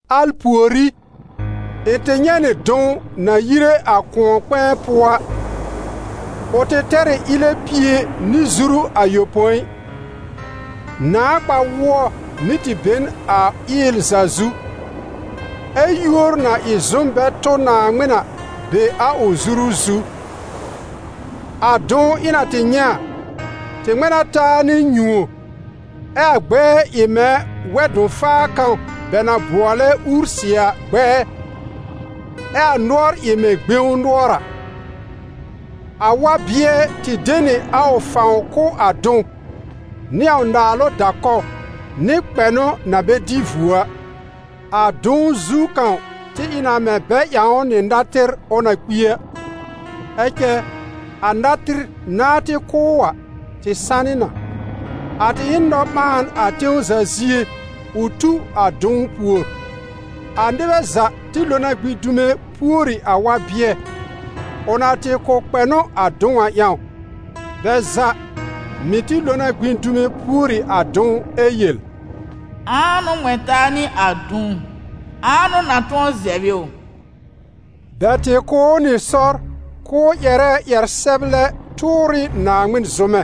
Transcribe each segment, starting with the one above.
Al pùorí, ɩ̃ tɩ nyɛ̃ nɩ dʋ̃w na yire a kʋ̃ɔ-kpɛ̃ɛ pʋɔ a. Ʋ tɩ tɛr ɩ ɩlɛ pie nɩ zuru ayopõi; nãà kpa-wʋɔ mɩ́ tɩ be n a ɩɩl za zu, ɛ́ yúor na ɩ zʋm bɛ tʋ Naaŋmɩn a be a ʋ zuru zu. A dʋ̃w ɩ̃ na tɩ nyɛ̃ a, tɩ ŋmɛ̃ na taa nɩ nyũo, ɛ a gbɛɛ ɩ mɛ̃ wɛ-dʋ̃-faa kãw bɛ na bʋɔlɛ ursɩ a gbɛɛ, ɛ a nʋɔr ɩ mɛ̃ gbẽw nʋɔr a. A wa-bɩɛ tɩ de nɩ a ʋ fãw kʋ̀ a dʋ̃w, nɩ a ʋ naalʋ da-kɔw nɩ kpɛnʋ na bɛ dɩ vuo a. A dʋ̃w zu kãw tɩ ɩ na mɛ̃ bɛ ƴãw ʋ nɩ natɩr ʋ na kpi a, ɛ cɛ, a natɩr nãá tɩ kʋ́ ʋ a, tɩ sanɩ na. A tɩ ɩ n nɔ-ɓãan a tẽw za zie, ʋ tu a dʋ̃w pùor. A nɩbɛ za tɩ lo na gbĩ dume pùori a wa-bɩɛ, ʋ na tɩ kʋ̀ kpɛnʋ a dʋ̃w a ƴãw. Bɛ za mɩ̀ tɩ lo na gbĩ dume pùori a dʋ̃w ɛ yel: «Ãa n'ʋ ŋmɛ̃ taa nɩ a dʋ̃w? Ãa n'ʋ na tʋ̃ɔ zɛb ɩ ʋ?» Bɛ tɩ kʋ̀ ʋ nɩ sɔr k'ʋʋ ƴɛrɛ ƴɛr-sɛblɛ tʋʋr ɩ Naaŋmɩn zʋmɛ;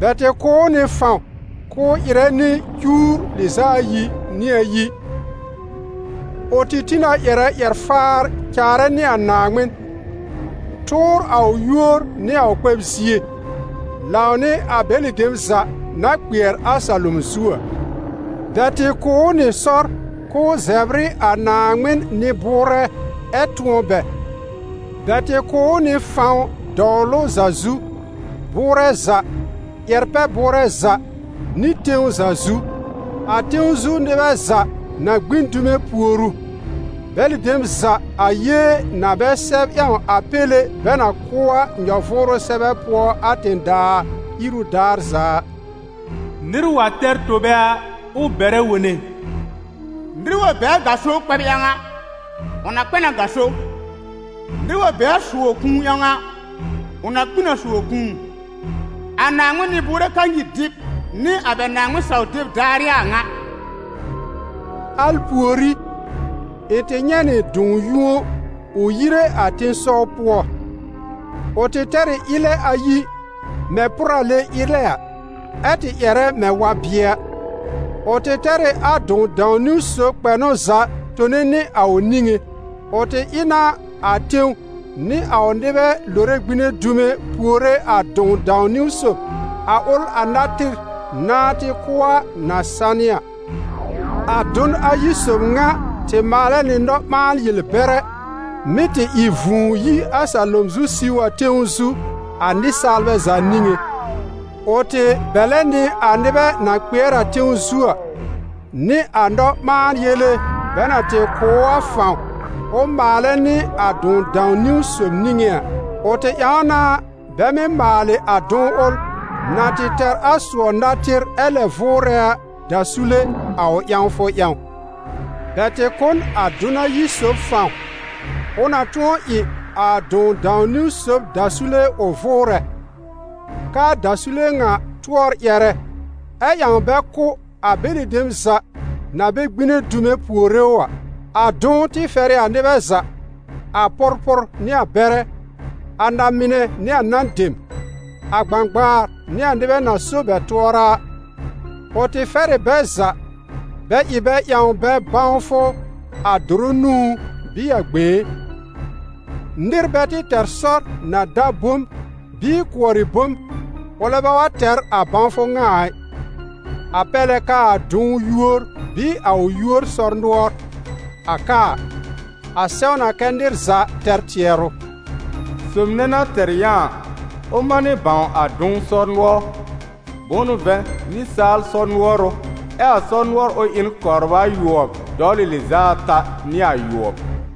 bɛ tɩ kʋ̀ ʋ nɩ fãw k'ʋʋ ɩrɛ nɩ cuwr lɩz'a ayi nɩ ayi. Ʋ tɩ tĩ na ƴɛrɛ ƴɛr-faar caarɛ nɩ a Naaŋmɩn, tʋʋr a ʋ yúor nɩ a ʋ kpɛb-zie, lãwnɩ a bɛlɩ dem za na kpɩɛr a salom zu a. Bɛ tɩ kʋ̀ ʋ nɩ sɔr k'ʋʋ zɛbr ɩ a Naaŋmɩn nɩ-bʋʋrɛ ɛ tʋ̃ɔ bɛ; bɛ tɩ kʋ̀ ʋ nɩ fãw dɔwlʋ za zu, bʋʋrɛ za, ƴɛr-pɛ-bʋʋrɛ za nɩ tẽw za zu. A tẽw zu nɩbɛ za na gbĩ n dume pùor ʋ, bɛlɩ dem za a yée na bɛ sɛb ƴãw a Péle bɛ na kʋ́ a nyɔ-vʋʋrʋ sɛbɛ pʋɔ a tẽ-daa iru daar za a.» «Nɩr wa tɛr tobe a, ʋ bɛrɛ wone. Nɩr wa be a gaso kpɛb ƴãw a, ʋ na kpɛ n a gaso; nɩr wa be a sʋɔ-kũu ƴãw a, ʋ na kpi n a sʋɔ-kũu. A Naaŋmɩn nɩ-bʋʋrɛ kanyir dɩb nɩ a bɛ Naaŋmɩn saw-deb daar ɩ a a ŋa.» Al pùorí, ɩ̃ tɩ nyɛ̃ nɩ dʋ̃w yũo ʋ yire a tẽ-sɔw pʋɔ. Ʋ tɩ tɛr ɩ ɩlɛ ayi, mɛ̃ pʋrale ɩlɛ a, ɛ́ tɩ ƴɛrɛ mɛ̃ wa-bɩɛ a. Ʋ tɩ tɛr ɩ a dʋ̃w dãw-niwn sob kpɛnʋ za tone nɩ a ʋ niŋé. Ʋ tɩ ɩ na a tẽw nɩ a ʋ nɩbɛ lore gbine dume puore a dʋ̃w dãw-niwn sob, a ʋl a natɩr nãá tɩ kʋ́ a na sanɩ a. A dʋn ayi sob ŋa tɩ maalɛ nɩ nɔ-ɓãa-yel-bɛrɛ, mɩ́ tɩ ɩ vũu yi a salom zu siw a tẽw zu, a nɩsaalbɛ za niŋé. Ʋ tɩ bɛ̀lɛ nɩ a nɩbɛ na kpɩɛr a tẽw zu a, nɩ a nɔ-ɓãa-yele bɛ na tɩ kʋ̀ ʋ a fãw ʋ maalɛ nɩ a dʋ̃w dãw-niwn sob niŋé a. Ʋ tɩ ƴãw na bɛ mɩ́ maalɩ a dʋ̃w ʋl, na tɩ tɛr a sʋɔ natɩr ɛ lɛ vʋʋrɛ a, dasule a ʋ ƴãwfʋ ƴãw. Bɛ tɩ kʋ̀ n a dʋn ayi sob fãw, ʋ na tʋ̃ɔ ɩ a dʋ̃w dãw-niwn sob dasule ʋ vʋʋrɛ, k'aa dasule ŋa tʋɔr ƴɛrɛ ɛ ƴãw bɛ kʋ́ a bɛlɩ dem za na bɛ gbine dume puore ʋ a. A dʋ̃w tɩ fɛr ɩ a nɩbɛ za, a pʋrpʋr nɩ a bɛrɛ, a na-mɩnɛ nɩ a nan dem, a gbãgbaar nɩ a nɩbɛ na so bɛ tʋɔra a, ʋ tɩ fɛr ɩ bɛ za bɛ ɩ bɛ ƴãw bɛ bãwfʋ a dʋrʋ nũú bɩɩ a gbẽé. Nɩr bɛ tɩ tɛr sɔr na da bom bɩɩ kʋɔrɩ bom, ʋlɛ bɛ wa tɛr a bãwfʋ ŋa a ɩ, a pɛr lɛ k'aa dʋ̃w yúor bɩɩ a ʋ yúor sɔr-nʋɔr. A ka a, a sɛw na kɛ́ nɩr za tɛr tɩɛrʋ. Sob nɛ na tɛr yã a, ʋ manɩ bãw a dʋ̃w sɔr-nʋɔr, bʋ̃ʋ n'ʋ vɛ̃ nɩsaal sɔr-nʋɔr ʋ, ɛ a sɔr-nʋɔr ʋl ɩ n kɔbr ayʋɔb dɔwlɩ lɩz'a ata nɩ ayʋɔb.